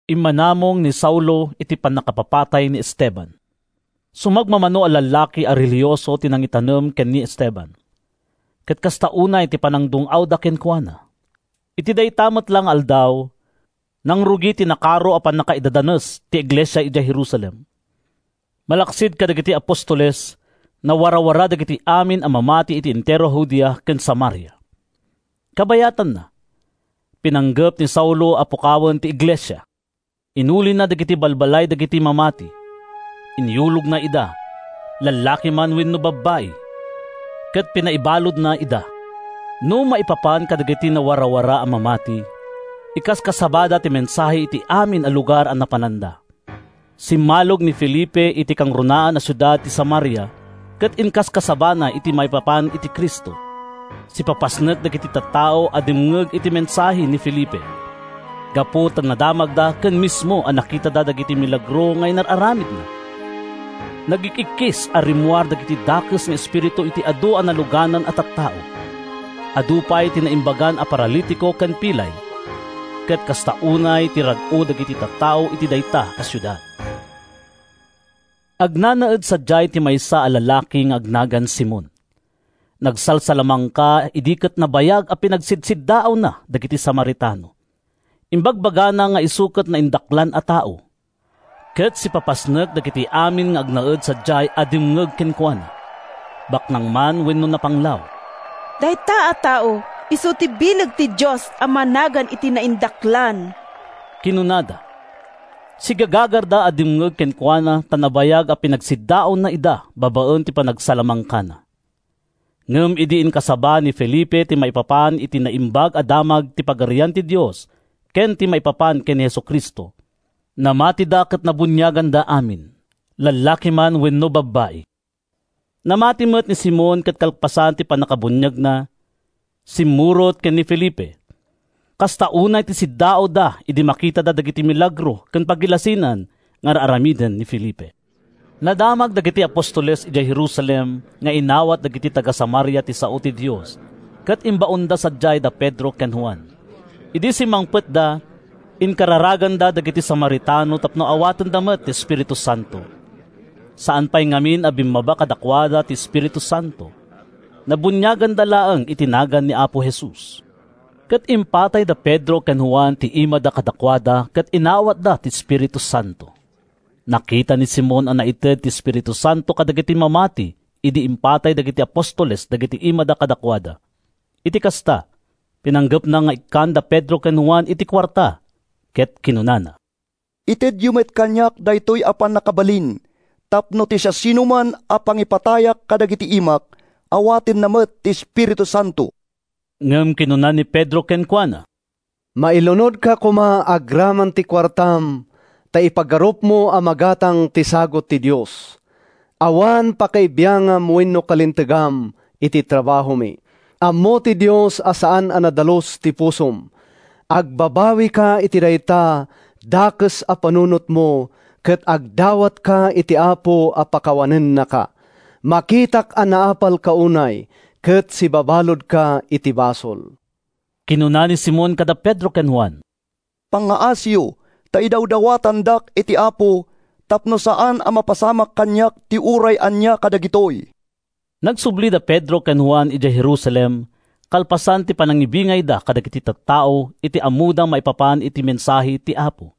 Immanamong ni Saulo iti pannakapapatay ni Esteban. Sumagmamano a lallaki a relihioso ti nangitanem ken ni Esteban, ket kasta unay ti panangdung-awda kenkuana. Iti dayta met la nga aldaw, nangrugi ti nakaro a pannakaidadanes ti iglesia idiay Jerusalem. Malaksid kadagiti apostoles, nawarawara dagiti amin a mamati iti entero a Judea ken Samaria. Kabayatanna, pinanggep ni Saulo a pukawen ti iglesia. Inulina dagiti balbalay dagiti mamati, inyulogna ida—lallaki man wenno babbai—ket pinaibaludna ida. No maipapan kadagiti nawarawara a mamati, inkaskasabada ti mensahe iti amin a lugar a napananda. Simmalog ni Felipe iti kangrunaan a siudad ti Samaria ket inkaskasabana ti maipapan iti Cristo. Sipapasnek dagiti tattao a dimngeg iti mensahe ni Felipe, gapu ta nadamagda ken mismo a nakitada dagiti milagro nga inaramidna. Nagik-ikkis a rimmuar dagiti dakes nga espiritu iti adu a naluganan a tattao. Adu pay ti naimbagan a paralitiko ken pilay. Ket kasta unay ti rag-o dagiti tattao iti dayta a siudad. Agnanaed sadiay ti maysa a lalaki nga agnagan Simon. Nagsalsalamangka idi ket nabayag a pinagsidsiddaawna dagiti Samaritano. Imbagbagana nga isu ket naindaklan a tao, ket sipapasnek dagiti amin nga agnaed sadiay a dimngeg kenkuana, baknang man wenno napanglaw. “Dayta a tao isu ti bileg ti Dios a managan iti Naindaklan,” kinunada. Sigagagarda a dimngeg kenkuana ta nabayag a pinagsiddaawna ida babaen ti panagsalamangkana. Ngem idi inkasaba ni Felipe ti maipapan iti Naimbag a Damag ti Pagarian ti Dios ken ti maipapan ken ni Jesu-Cristo, namatida ket nabuniaganda amin, lallaki man wenno babbai. Namati met ni Simon ket kalpasan ti pannakabuniagna, simmurot ken ni Felipe. Kasta unay ti siddaawna idi makitana dagiti milagro ken pagilasinan nga ar-aramiden ni Felipe. Nadamag dagiti apostoles idiay Jerusalem nga inawat dagiti taga-Samaria ti sao ti Dios ket imbaonda sadiay da Pedro ken Juan. Idi simmangpetda, inkararaganda dagiti Samaritano tapno awatenda met ti Espiritu Santo. Saan pay ngamin a bimmaba kadakuada ti Espiritu Santo. Nabuniaganda laeng iti nagan ni Apo Jesus. Ket impatay da Pedro ken Juan ti imada kadakuada ket inawatda ti Espiritu Santo. Nakita ni Simon a naited ti Espiritu Santo kadagiti mamati idi impatay dagiti apostoles dagiti imada kadakuada. Iti kasta, pinanggepna nga ikkan da Pedro ken Juan iti kuarta ket kinunana, “Itedyo met kaniak daytoy a pannakabalin tapno ti siasinoman a pangipatayak kadagiti imak awatenna met ti Espiritu Santo.” Ngem kinuna ni Pedro kenkuana, “Mailunodka koma agraman ti kuartam ta ipagarupmo a magatang ti sagut ti Dios! Awan pakaibiangam wenno kalintegam iti trabahomi. Ammo ti Dios a saan a nadalus ti pusom. Agbabawika iti dayta dakes a panunotmo ket agdawatka iti Apo a pakawanennaka. Makitak a naapalka unay ken sibabaludka iti basol.” Kinuna ni Simon kada Pedro ken Juan, “Pangngaasiyo ta idawdawatandak iti Apo tapno saan a mapasamak kaniak ti uray ania kadagitoy.” Nagsubli da Pedro ken Juan idiay Jerusalem kalpasan ti panangibingayda kadagiti tattao iti ammoda maipapan iti mensahe ti Apo.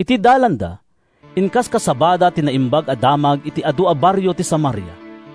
Iti dalanda, inkaskasabada ti Naimbag a Damag iti adu a barrio ti Samaria.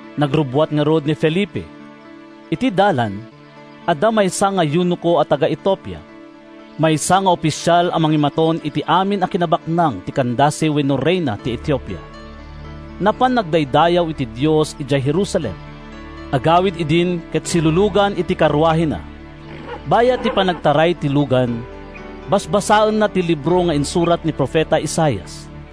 Nagrubbuat ngarud ni Felipe. Iti dalan, adda maysa nga eunoko a taga-Etiopia, maysa nga ofisial a mangimaton iti amin a kinabaknang ti Candace wenno Reyna ti Etiopia. Napan nagdaydayaw iti Dios idiay Jerusalem. Agawid idin ket silulugan iti karuahena. Bayat ti panagtaray ti lugan, basbasaenna ti libro nga insurat ni profeta Isaias.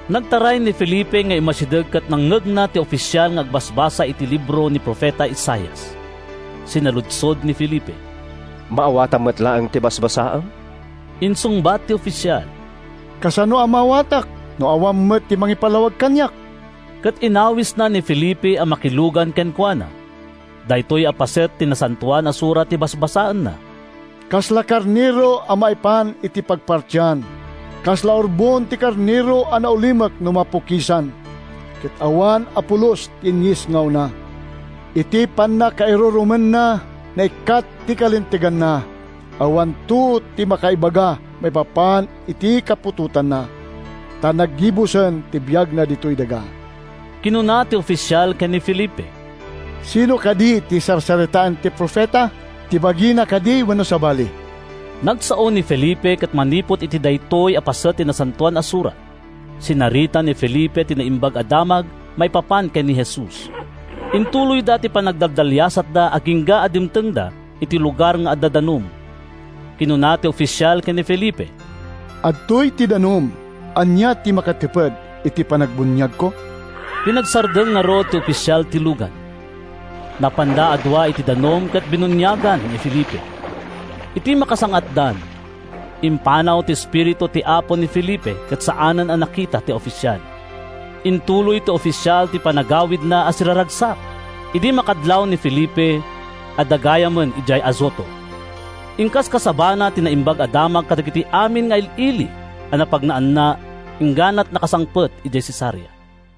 Nagtaray ni Felipe nga immasideg ket nangngegna ti ofisial nga agbasbasa iti libro ni profeta Isaias. Sinaludsod ni Felipe, “Maawatam met laeng ti basbasaem?” Insungbat ti ofisial, “Kasano a maawatak no awan met mangipalawag kaniak?” Ket inawisna ni Felipe a makilugan kenkuana. Daytoy a paset ti Nasantoan a Surat ti basbasaenna: “Kasla karnero a maipan iti pagpartian, Kasla urbon ti karnero a naulimek no mapukisan, Ket awan a pulos ti inyesngawna. Iti pannakairurumenna, naikkat ti kalinteganna. Awanto ti makaibaga maipapan iti kaputotanna, Ta naggibusen ti biagna ditoy daga.” Kinuna ti ofisial ken ni Felipe, “Sinno kadi ti sarsaritaen ti profeta? Ti bagina kadi wenno sabali?” Nagsao ni Felipe ket manipud iti daytoy a paset ti Nasantoan a Surat, sinarita ni Felipe ti Naimbag a Damag maipapan ken ni Jesus. Intuloyda ti panagdaliasatda agingga a dimtengda iti lugar nga adda danum. Kinuna ti ofisial ken ni Felipe, “Adtoy ti danum. Ania ti makatiped iti panagbuniagko?” Pinagsardeng ngarud ti ofisial ti lugan. Napanda a dua iti danum ket binuniagan ni Felipe. Idi makasang-atdan, impanaw ti Espiritu ti Apo ni Felipe ket saanen a nakita ti ofisial. Intuloy ti ofisial ti panagawidna a siraragsak. Idi makadlaw ni Felipe, adda gayamen idiay Azoto. Inkaskasabana ti Naimbag a Damag kadagiti amin nga il-ili a napagnaanna ingganat nakasangpet idiay Cesarea.